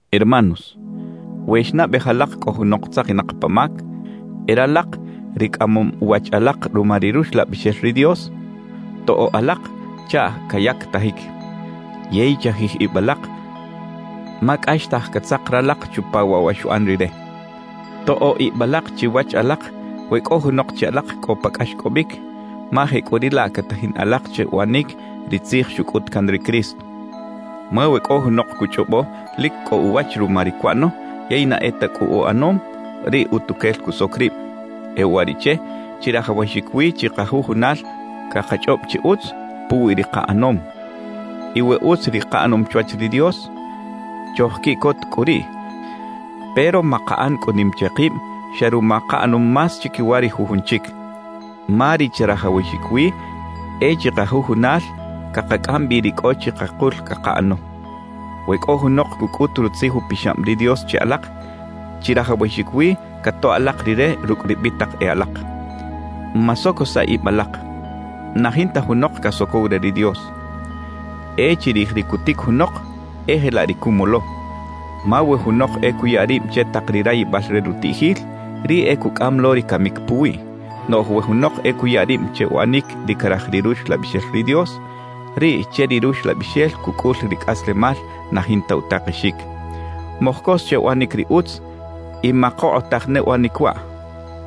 Hermanos, we xnaꞌbej alak cꞌo junok tzakinak pa mac, e ralak ri cꞌamom wach alak ruma ri Ruxlabixel ri Dios, toꞌo alak chaꞌ cayactajic. Yey chajij ib alak ma cꞌaxtaj catzak ralak chupa waꞌ wa xuꞌan rire. Toꞌo ib alak chiwach alak we cꞌo junok che alak cꞌo pa cꞌaxcꞌobic, ma jecꞌuriꞌlaꞌ catajin alak che uꞌanic ri tzij xucꞌut can ri Cristo. Ma we cꞌo junok cuchꞌobo lic cꞌo uwach ruma ri cuꞌano yey na e ta cꞌu uꞌanom, riꞌ utuquel cusoc rib. E uwariꞌche chirajawaxic wi chikajujunal cakachꞌob chi utz puwi ri kaꞌanom. Y we utz ri kaꞌanom chwach ri Dios, chojquiꞌcot cꞌu riꞌ, pero makaꞌan cꞌu nim che kib xa ruma kaꞌanom más chiquiwa ri jujun chic. Ma ri chirajawaxic wi e chikajujunal cakacꞌam bi ri cꞌo chikakul cakaꞌano. We cꞌo junok cucꞌut Rutzij Upixab ri Dios che alak, chirajawaxic wi catoꞌ alak rire rucꞌ ri bitak e alak. Masocosaꞌ ib alak: Na jinta junok casocow re ri Dios. E chirij ri cutic junok, e jelaꞌ ri cumolo. Ma we junok e cuya rib che tak ri rayibal re rutiꞌjil, riꞌ e cucꞌam lo ri camic puwiꞌ. Noꞌj we junok e cuya rib che uꞌanic ri caraj ri Ruxlabixel ri Dios, riꞌ che ri Ruxlabixel cucꞌul ri cꞌaslemal na jinta utakexic. Mojcos che uꞌanic ri utz y makokꞌotaj ne uꞌanic waꞌ,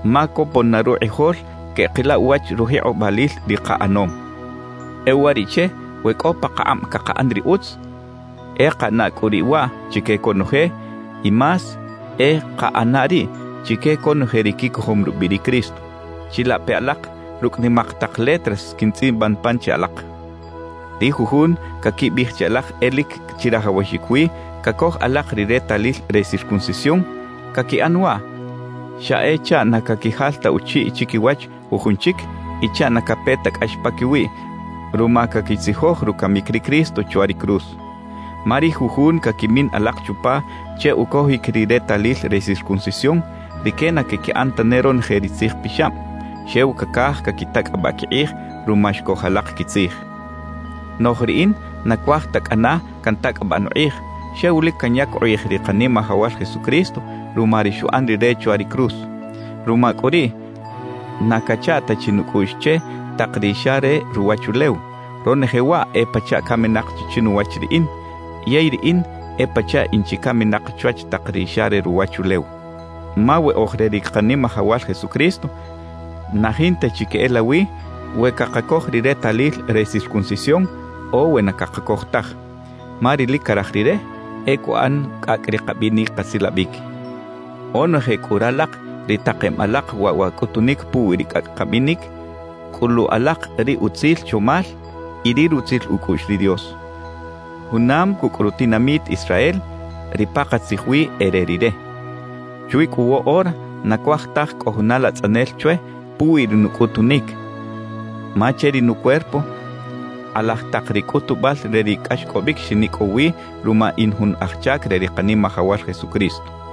ma copon na rukꞌijol queꞌkila uwach rujikꞌobalil ri kaꞌanom. E uwariꞌche, we cꞌo pakakꞌab cakaꞌan ri utz, e kaꞌana cꞌu riꞌ waꞌ chique conoje, y más e kaꞌana riꞌ chique conoje ri quicojom rubiꞌ ri Cristo. Chilape alak, rucꞌ nimak tak letras quintzꞌiban pan che alak. Ri jujun caquibiꞌij che alak e lic chirajawaxic wi cacoj alak ri retalil re circuncisión, caquiꞌan waꞌ xa e chaꞌ na caquijal ta uchiꞌ chiquiwach jujun chic y chaꞌ na cape ta cꞌax paquiwiꞌ ruma caquitzijoj rucamic ri Cristo chwa ri cruz. Ma ri jujun caquimin alak chupa che ucojic ri retalil re circuncisión, rique na caquiꞌan tane ronoje ri Tzij Pixab; xew cacaj caquitacꞌabaꞌ quikꞌij ruma xcoj alak quitzij. Noꞌj riꞌin na cuaj ta cꞌana cantacꞌabaꞌ nukꞌij, xew lic canyac ukꞌij ri Kanimajawal Jesucristo ruma ri xuꞌan Rire chwa ri cruz. Ruma cꞌu riꞌ, na cacha ta chi nucꞌuꞌx che tak ri xa re ruwachulew; ronoje waꞌ e pachaꞌ caminak chi chinuwach riꞌin; yey riꞌin e pachaꞌ in chi caminak chwach tak ri xa re ruwachulew. Ma we oj re ri Kanimajawal Jesucristo, na jinta chi queꞌelawi we cakacoj ri retalil re circuncisión o we na cakacoj taj; ma ri lic caraj Rire, e cuꞌan cꞌacꞌ ri kabinic kasilabic. Onoje cꞌu ralak ri takem alak waꞌ wa cꞌutunic puwi ri cꞌacꞌ kabinic, cꞌulu alak ri utzil chomal y ri rutzil ucꞌuꞌx ri Dios, junam cucꞌ rutinamit Israel, ri pakatzij wi e re Rire. Chwi cꞌu woꞌora, na cuaj taj cꞌo juna latzꞌanel chwe puwi ri nucꞌutunic, ma che ri nucuerpo kꞌalaj tak ri cꞌutubal re ri cꞌaxcꞌobic xinicꞌow wi ruma in jun aj chac re ri Kanimajawal Jesucristo.